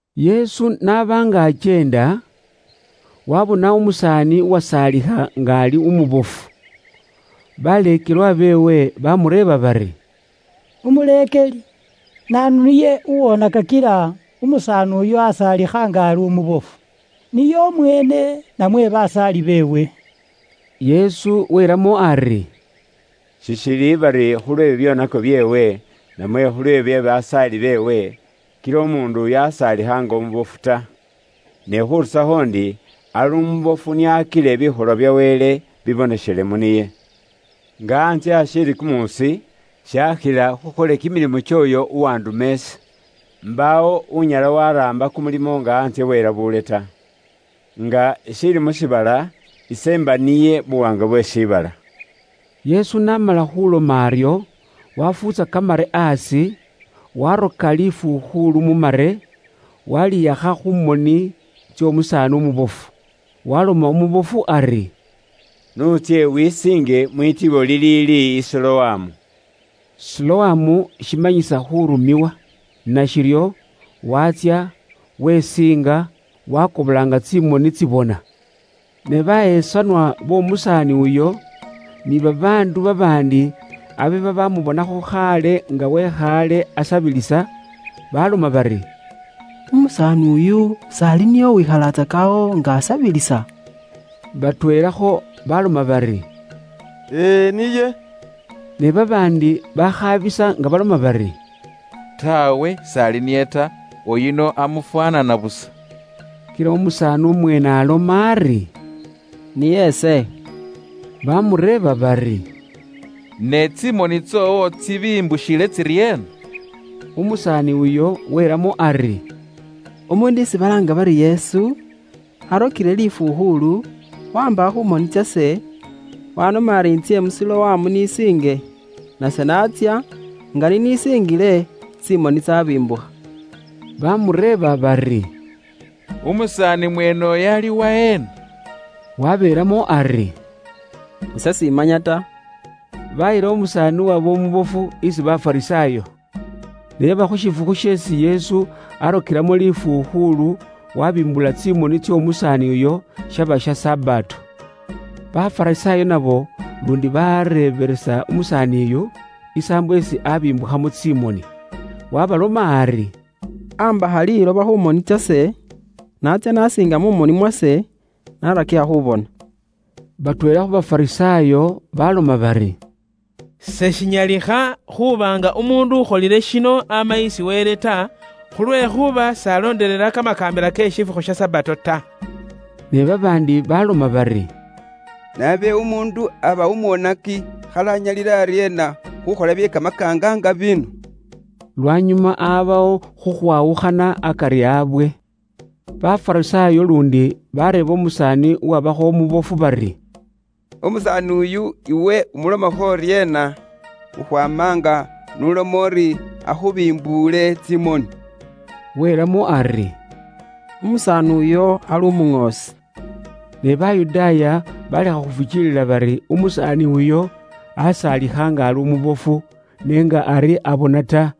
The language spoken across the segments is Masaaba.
Yesu n'aba nga akyeenda, waabona umusaani uwasaalikha nga ali umubofu. Baleekelwa beewe baamureeba bari, “Umuleekeli, naanu niye uwoonaka kila umusaani uyu asaalikha nga ali umubofu? Niye umweene namwe basaali beewe?” Yesu welamo ari, “Sishili bari khulwe bibyoonako byeewe, namwe khulwe bye basaali beewe, kila umuundu uyu asaalikha nga umubofu ta. Ne khurusakho ndi ali umubofu nio akile bikholwa bya Wele biboneshele mu niye. Nga antsye ashiili kumuusi, shaakhila khukhole kimilimo kyooyo uwanduma ise. Mbaawo unyala waraamba kumulimo nga antsye bwelabuule ta. Nga ishiili mu shiibala, ise mba niye buwaanga bwe shiibala.” Yesu n'amala khuloma aryo, wafuutsa kamare aasi, waroka lifukhuulu mu mare, walihakha khu moni tsy'omusaani umubofu. Waloma umubofu ari, “N'utsye wisiinge mwitibo liliili i Siloamu” (Siloamu shimanyisa khuurumiwa). Nashiryo waatsya, wesiinga, waakobola nga tsimoni tsibona. Ne bahesanwa b'omusaani uyo, ni babaandu babaandi abe babamubonakho khaale nga wekhaale asabilisa, baloma bari, “Umusaani uyu s'ali niye uwekhalatsaka awo nga asabilisa?” Batweelakho baloma bari, “E e, niye.” Ne babaandi bakhaabisa nga baloma bari, “Taawe, s'ali niye ta. Uyuno amufwaanana busa.” Kila umusaani umweene aloma ari, “Niye ise.” Bamureeba bari, “Ne tsimoni tsoowo tsibimbushile tsiryeena?” Umusaani uyo welamo ari, “Umuundu isi balaanga bari Yesu, arokile lifukhuulu, waambakha khu moni tsase, wanoma ari intsye mu Siloamu nisiinge. Nase natsya, nga ninisingile, tsimoni tsabimbukha.” Bamureeba bari, “Umusaani mweene uyo ali waheena?” Wabeelamo ari, “Ise simanya ta.” Bayila umusaani uwaba umubofu isi Bafarisaayo. Ne yaba khu shifukhu sheesi Yesu arokelamo lifukhuulu wabimbula tsimoni tsy'omusaani uyo, shaba sha Sabato. Bafarisaayo nabo luundi baareebelesa umusaani uyo, isaambo isi abimbukhamo tsimoni. Wabaloma ari “Ambakha liiloba khu moni tsase, natsya nasiinga mu moni mwase, narakikha khubona.” Batweela khu Bafarisaayo baaloma bari, “Seshinyalikha khuuba nga umuundu ukholile shino ama isi Wele ta, khulwekhuuba s'alondelela kamakaambila ke shifukhu sha Sabato ta.” Ne babaandi baloma bari, “Ne abe umuundu aba umwonaki khali anyalile aryeena khukhola bye kamakaanga nga bino?” Lwanyuma abawo khukhwawukhana akari abwe. Bafarisaayo luundi bareeba umusaani uwabakho umubofu bari, “Umusaani uyu iwe umulomakho uryeena, khukhwaama nga n'uloma uri akhubimbuule tsimoni?” Welamo ari, “Umusaani uyo ali umuŋoosi.” Ne Bayudaaya balekha khufukiilila bari umusaani uyo asaalikha nga ali umubofu, ne nga ari abona ta,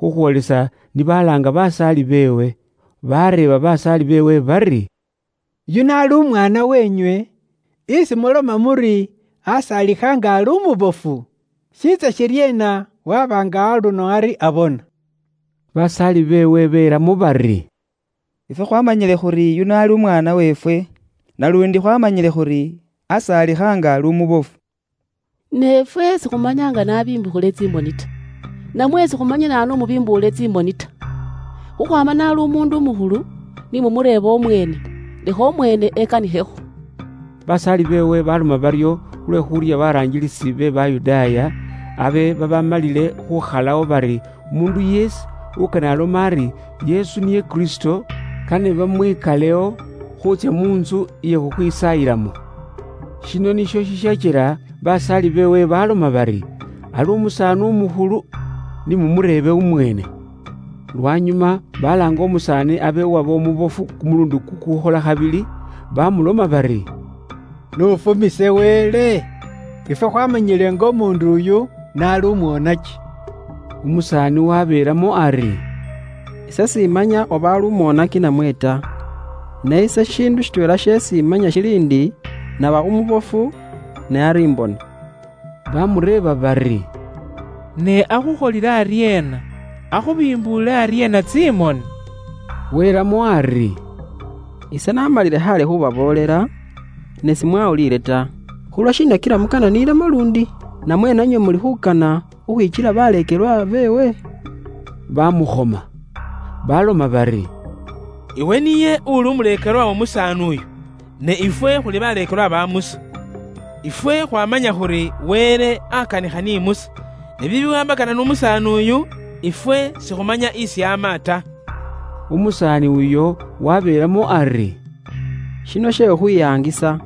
khukhwoolisa ni balaanga basaali beewe. Bareeba basaala beewe bari, “Uyuno ali umwaana wenywe, isi muloma muri asaalikha nga ali umubofu? Shiitsa shiryeena waba nga aluno ari abona?” Basaali beewe belamo bari, “Ifwe khwaamanyile khuri uyuno ali umwaana weefwe, naluundi khwaamanyile khuri asaalikha nga ali umubofu. Ne ifwe sikhumanya nga n'abimbukhile tsimoni ta, namwe sikhumanya naanu umubimbuule tsimoni ta. Khukhwaama n'ali umuundu umukhulu, ni mumureebe umweene; lekha umweene ekanikhekho.” Basaali beewe baaloma baryo khulwe khuurya baraangilisi be Bayudaaya, abe babaamalile khuukhalawo bari umuundu yeesi ukane alome ari Yesu niye Kristo, kane bamwikalewo khuutsya mu ntsu iye khukhwisaayilamo. Shino nisho shishakila basaali beewe baaloma bari, “Ali umusaani umukhulu, ni mumureebe umweene.” Lwanyuma balaanga umusaani abe uwaba umubofu kumuluundi kukukhola khabili, bamuloma bari, “Iwe n'uruuye Wele! Ifwe khwaamanyile nga umuundu uyu n'ali umwonaki.” Umusaani wabeelamo ari, “Ise s'imanya oba ali umwonaki namwe ta. Ne ise shishiindu shitweela sheesi imanya shili ndi, naba umubofu, ne ari imbona.” Bamureeba bari, “Ne akhukholile aryeena? Akhubimbuule aryeena tsimoni?” Welamo ari, “Ise namalile khaale khubaboolela, ne simuwulila ta. Khulwashiina kila mukana niilemo luundi? Namwe nanywe muli khukana khukhwikyela baleekelwa beewe?” Bamukhoma. Baloma bari, “Iwe niye uli umuleekelwa w'omusaani uyo. Ne ifwe khuli baleekelwa ba Musa. Ifwe khwaamanya khuri Wele akanikha ni Musa, ne bibiwaambakana n'umusaani uyu, ifwe sikhumanya isi ama ta.” Umusaani uyo wabeelamo ari, “Shino she khukhwiyaangisa!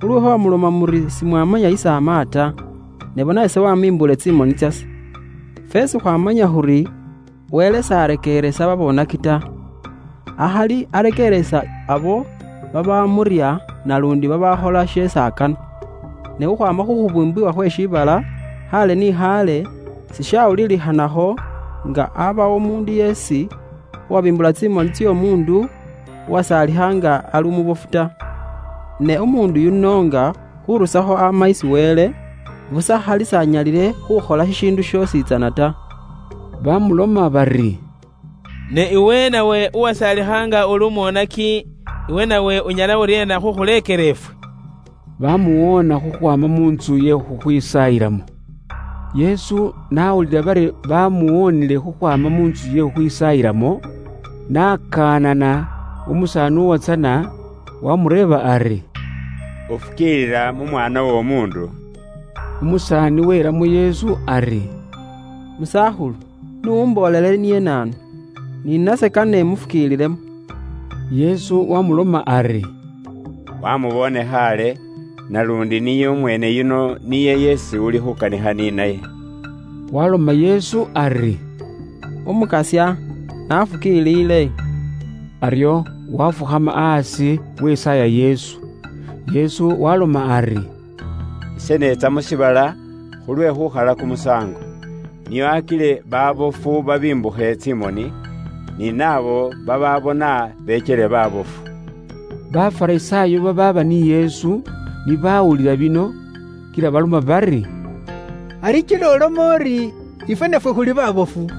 Khulwekhuuba muloma muri simumanya isi ama ta, ne bona ise wamimbuule tsimoni tsase. Feesi khwaamanya khuri Wele s'arekeeresa babonaki ta, akhali arekeeresa abo babamurya naluundi babaakhola sheesi akana. Ne khukhwaama khukhubuumbibwa khwe shiibala khaale ni khaale, sishawulilikhanakho nga abawo umuundu yeesi uwabimbula tsimoni tsy'omuundu uwasaalikha nga ali umubofu ta. Ne umuundu yuno nga khurusakho ama isi Wele, busa khali s'anyalile khukhola shishiindu shoositsana ta.” Bamuloma bari, “Ne iwe nawe uwasaalikha nga uli umwonaki, iwe nawe unyala uryeena khukhuleekela ifwe?” Bamuwoona khukhwaama mu ntsu ye khukhwisaayilamo. Yesu n'awulila bari bamuwoonile khukhwaama mu ntsu ye khukhwisaayilamo, ne n'akaanana umusaani uwatsana, waamureeba ari, “Ufukiilila mu Mwaana w'Omuundu?” Umusaani welamo Yesu ari, “Musakhulu, n'umboolele niye naanu, ni nase kane imufukiililemo.” Yesu wamuloma ari, “Wamuboone khaale, naluundi niye umweene yuno niye yeesi ulikho ukanikha ni naye.” Waloma Yesu ari, “Umukasya, naafukiilile.” Aryo wafukhama aasi wesaaya Yesu. Yesu waaloma ari, “Ise neetsa mu shiibala khulwe khukhala kumusaango. Nio akile baabofu babimbukhe tsimoni; ni naabo babaabona bekyele baabofu.” Bafarisaayo babaaba ni Yesu ni baawulila bino kila baloma bari, “Ari kila uloma uri ifwe nafwe khuli baabofu?”